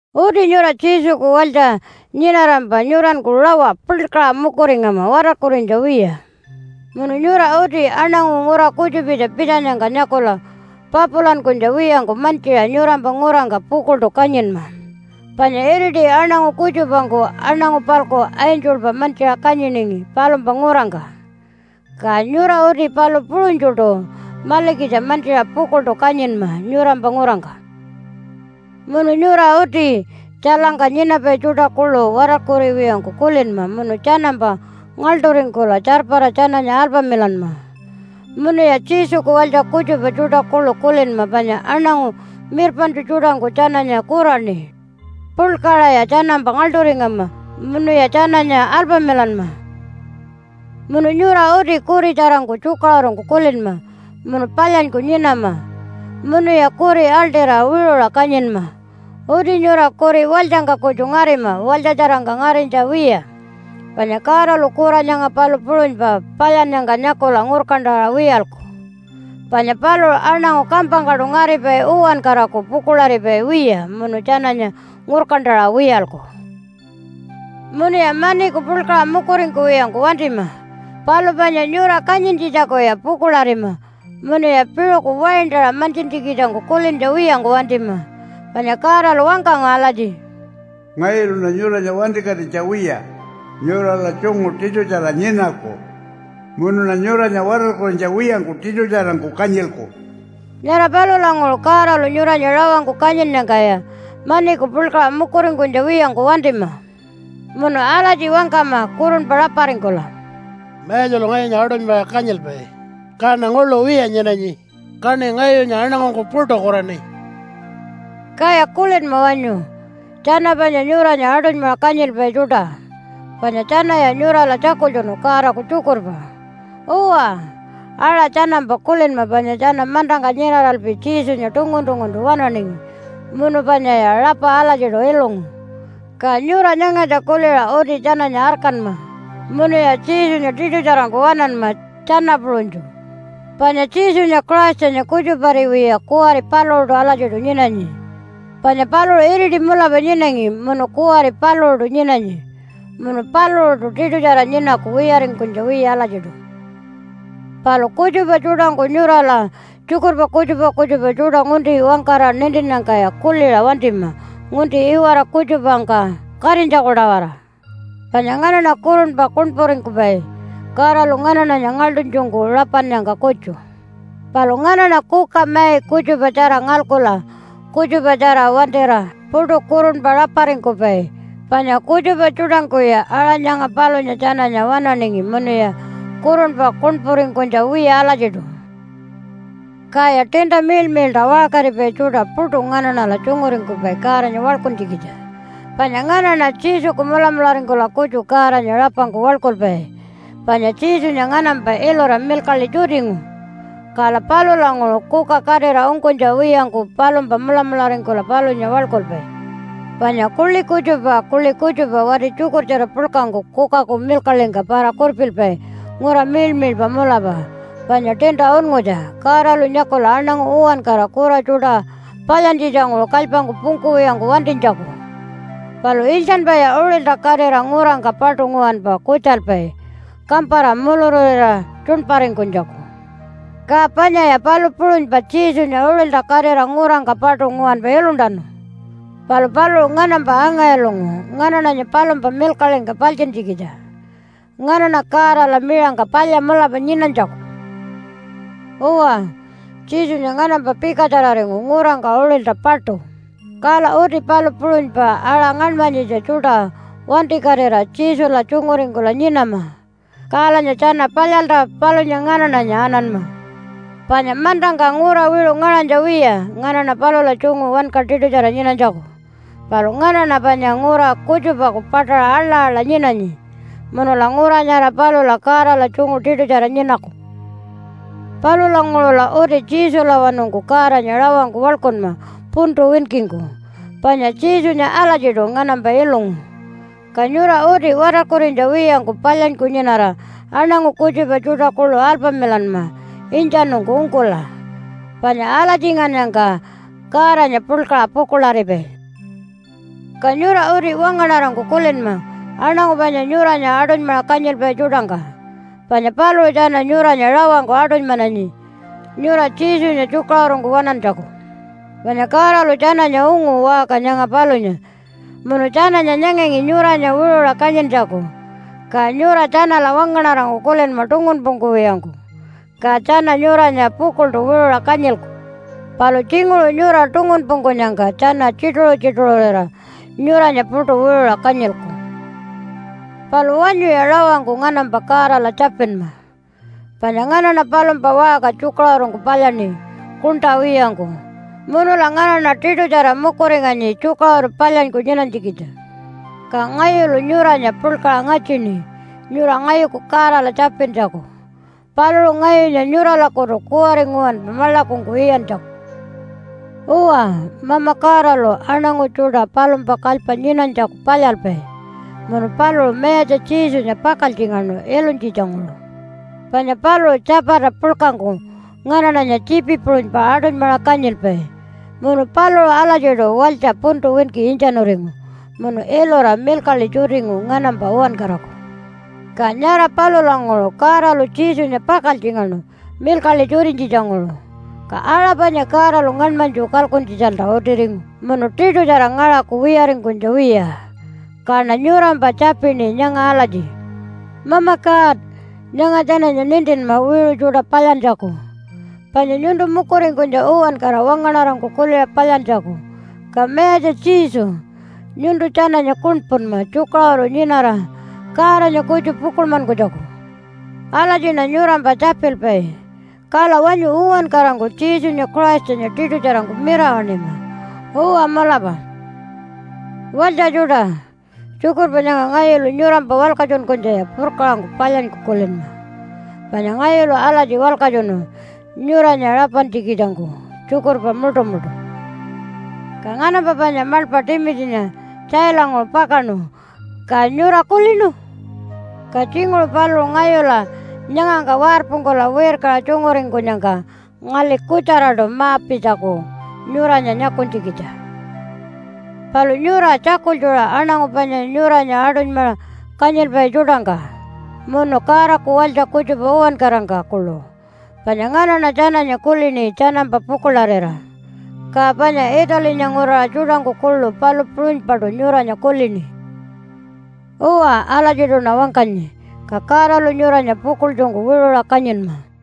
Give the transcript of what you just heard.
Uti nyura Jesuku walytja nyinarampa nyuranku rawa puḻkaṟa mukuringama watarkurinytja wiya. Munu nyura uti aṉangu ngura kutjupitja pitjanyangka nyakula papulankunytja wiyangku mantjiṟa nyurampa ngurangka pukuḻṯu kanyinma. Panya iriti aṉangu kutjupangku aṉangu-palku angelpa mantjiṟa kanyiningi palumpa ngurangka. Ka nyura uti palu puṟunytjuṯu malikitja mantjiṟa pukuḻṯu kanyinma nyurampa ngurangka. Munu nyura uti tjailangka nyinapai tjuṯa kuḻu watarkuriwiyangku kulinma munu tjanampa ngaḻṯuringkula tjarpara tjananya alpamilanma. Munuya Jesuku walytja kutjupa tjuṯa kuḻu kulinma panya aṉangu mirpaṉtju tjuṯangku tjananya kuraṉi. Puḻkaṟaya tjanampa ngaḻṯuringama munuya tjananya alpamilanma. Munu nyura uti kuritjarangku tjukaṟurungku kulinma munu palyanyku nyinama, munuya kuri aḻṯira wiṟuṟa kanyinma. Uti nyura kuri walytjangka kutju ngarima walytjatjarangka ngarinytja wiya. Panya Godalu kura nyanga palu puṟunypa palyannyangka nyakula ngurkantaṟa wiyalku. Panya paluṟu aṉangu kampangkaṯu ngaripai uwankaraku pukuḻaripai wiya munu tjananya ngurkantaṟa wiyalku. Munuya maniku puḻkaṟa mukuringkuwiyangku wantima. Palu panya nyura kanyintjitjakuya pukuḻarima, munuya piṟuku waintaṟa mantjintjikitjangku kulintja wiyangku wantima. Panya Godalu wangkangu alatji, “Ngayuluṉa nyuranya wantikatinytja wiya nyurala tjungu tiṯutjara nyinaku. Munuṉa nyuranya watarkurinytja wiyangku tiṯutjarangku kanyilku.” Nyara palulanguṟu Godalu nyuranya rawangku kanyinnyangkaya maniku puḻkaṟa mukuringkunytja wiyangku wantima. Munu alatji wangkama kurunpa raparingkula, “Mayatjalu ngayunya aṯunymaṟa kanyilpai kaṉa nguḻu wiya nyinanyi, Kaṉi ngayunya aṉangungku puṯu kuraṉi.” Kaya kulinma wanyu tjana panya nyuranya aṯunymaṟa kanyilpai tjuṯa, panya tjanaya nyurala tjakultjunu Godaku tjukurpa. Uwa, aṟa tjanampa kulinma panya tjana mantangka nyinaralpi Jesunya tungun-tunguntu waṉaningi munu panyaya rapa alatjiṯu ilungu. Ka nyura nyangatja kuliṟa uti tjananya arkanma munuya Jesunya tiṯutjarangku waṉanma tjana puṟunytju. Panya Jesunya Christanya kutjupariwiya kuwari paluṟuṯu alatjiṯu nyinanyi. Panya paluṟu iriti mulapa nyinangi, munu kuwari paluṟuṯu nyinanyi, munu paluṟuṯu tiṯutjara nyinaku wiyaringkunytja wiya alatjiṯu. Palu kutjupa tjuṯangku nyurala tjukurpa kutjupa kutjupa tjuṯa ngunti wangkara nintinnyangkaya kuliṟa wantima ngunti iwara kutjupangka katinytjaku-tawara. Panya nganaṉa kurunpa kuṉpuringkupai Godalu nganaṉanya ngaḻṯunytjungku rapannyangka kutju. Palu nganaṉa kuka mai kutjupatjara ngalkula kutjupatjara wantira puṯu kurunpa raparingkupai. Panya kutjupa tjuṯangkuya aṟa nyanga palunya tjananya waṉaningi munuya kurunpa kuṉpuringkunytja wiya alatjiṯu. Kaya tiinta miḻmiḻṯa waṟkaripai tjuṯa puṯu nganaṉala tjunguringkupai Godanya waḻkuntjikitja. Panya nganaṉa Jesuku mulamularingkula kutju Godanya rapangku waḻkulpai, panya Jesunya nganampa ilura milkaḻi tjutingu. Kala palulanguṟu kuka katira ungkunytja wiyangku palumpa mulamularingkula palunya waḻkulpai. Panya kuḻi kutjupa kuḻi kutjupa wati tjukurtjara puḻkangku kukaku milkaḻingka para-kurpilpai ngura miḻmiḻpa mulapa panya tiinta unngutja Godalu nyakula aṉangu uwankara kura tjuṯa palyantjitjanguṟu kalypangku pungkuwiyangku wantinytjaku. Palu iltjanpaya uṟilta katira ngurangka paṯu nguwanpa kutjalpai kampara mulururira tjuṉparingkunytjaku. Ka panyaya palu puṟunypa Jesunya uṟilta katira ngurangka paṯu nguwanpa iluntanu. Palu paluṟu nganampa anga-ilungu nganaṉanya palumpa milkaḻingka paltjintjikitja nganaṉa Godala miṟangka palya mulapa nyinanytjaku. Uwa, Jesunya nganampa pikatjararingu ngurangka uṟilta paṯu, kala uti palu puṟunypa aṟa ngaṉmanyitja tjuṯa wantikatira Jesula tjunguringkula nyinama, kalanya tjana palyalta palunya nganaṉanya ananma. Panya mantangka ngura wiṟu ngaṟanytja wiya nganaṉa palula tjungu wanka tiṯutjara nyinanytjaku. Palu nganaṉa panya ngura kutjupaku paṯaṟa aḻa-aḻa nyinanyi, munula ngura nyara palula Godala tjungu tiṯutjara nyinaku. Palulanguṟula uti Jesulawanungku Godanya rawangku waḻkunma puntu winkingku, panya Jesunya alatjiṯu nganampa ilungu. Ka nyura uti watarkurinytja wiyangku palyanyku nyinara aṉangu kutjupa tjuṯa kuḻu alpamilanma intjanungku ungkula. Panya alatjingannyangka Godanya puḻkaṟa pukuḻaripai. Ka nyura uti wangaṉarangku kulinma aṉangu panya nyuranya aṯunymaṟa kanyilpai tjuṯangka. Panya paluṟu tjana nyuranya rawangku aṯunymananyi nyura Jesunya tjukaṟurungku waṉantjaku. Panya Godalu tjananya ungu waṟka nyanga palunya, munu tjananya nyanganyi nyuranya wiṟuṟa kanyintjaku. Ka nyura tjanala wangaṉarangku kulinma tungunpungkuwiyangku, ka tjana nyuranya pukuḻṯu wiṟuṟa kanyilku. Palu tjinguṟu nyura tungunpungkunyangka tjana tjituṟu-tjituṟurira nyuranya puṯu wiṟuṟa kanyilku. Palu wanyuya rawangku nganampa Godala tjapinma. Panya nganaṉa palumpa waṟka tjukaṟurungku palyaṉi kuṉṯa wiyangku, munula nganaṉa tiṯutjara mukuringanyi tjukaṟuru palyanyku nyinanytjikitja. Ka ngayulu nyuranya puḻkaṟa ngatjini nyura ngayuku Godala tjapintjaku paluṟu ngayunya nyuralakutu kuwari nguwanpa maḻakungku iyantjaku. Uwa, Mama Godalu aṉangu tjuṯa palumpa kalypa nyinanytjaku palyalpai. Munu paluṟu Mayatja Jesunya pakaltjingaṉu ilunytjitjanguṟu. Panya paluṟu tjapata puḻkangku nganaṉanya tjiipi puṟunypa aṯunymaṟa kanyilpai. Munu paluṟu alatjiṯu walytja puntu winki intjanuringu munu ilura milkaḻi tjutingu nganampa uwankaraku. Ka nyara palulanguṟu Godalu Jesunya pakaltjingaṉu milkaḻi tjutinytjitjanguṟu, ka aṟa panya Godalu ngaṉmanytju kalkuntjitjalta utiringu, munu tiṯutjara ngaṟaku wiyaringkunytja wiya. Kaṉa nyurampa tjapini nyanga alatji, “Mama God, nyanga tjananya nintinma wiṟu tjuṯa palyantjaku, panya nyuntu mukuringkunytja uwankara wangaṉarangku kuliṟa palyantjaku. Ka Mayatja Jesu, nyuntu tjananya kuṉpunma tjukaṟuru nyinara Godanya kutju pukuḻmankunytjaku.” Alatjiṉa nyurampa tjapilpai. Kala wanyu uwankarangku Jesunya Christanya tiṯutjarangku mirawaṉima! Uwa, mulapa. Walytja tjuṯa, tjukurpa nyanga ngayulu nyurampa walkatjunkunytjaya purkaṟangku palyanyku kulinma. Panya ngayulu alatji walkatjunu nyuranya rapantjikitjangku tjukurpa muṯumuṯu. Ka nganampa panya maḻpa Timitjinya tjailanguṟu pakaṉu, ka nyura kulinu? Ka tjinguṟu paluṟu ngayula nyangangka warpungkula wirkaṟa tjunguringkunyangka ngali kutjaraṯu ma-pitjaku nyuranya nyakunytjikitja. Palu nyura tjakultjura aṉangu panya nyuranya aṯunymaṟa kanyilpai tjuṯangka munu Godaku walytja kutjupa uwankarangka kuḻu, panya nganaṉa tjananya kulini tjanampa pukuḻarira. Ka panya Italinya nguraṟa tjuṯangku kuḻu palu puṟunypaṯu nyuranya kulini. Uwa, alatjiṯuṉa wangkanyi. Ka Godalu nyuranya pukuḻtjungku wiṟuṟa kanyinma.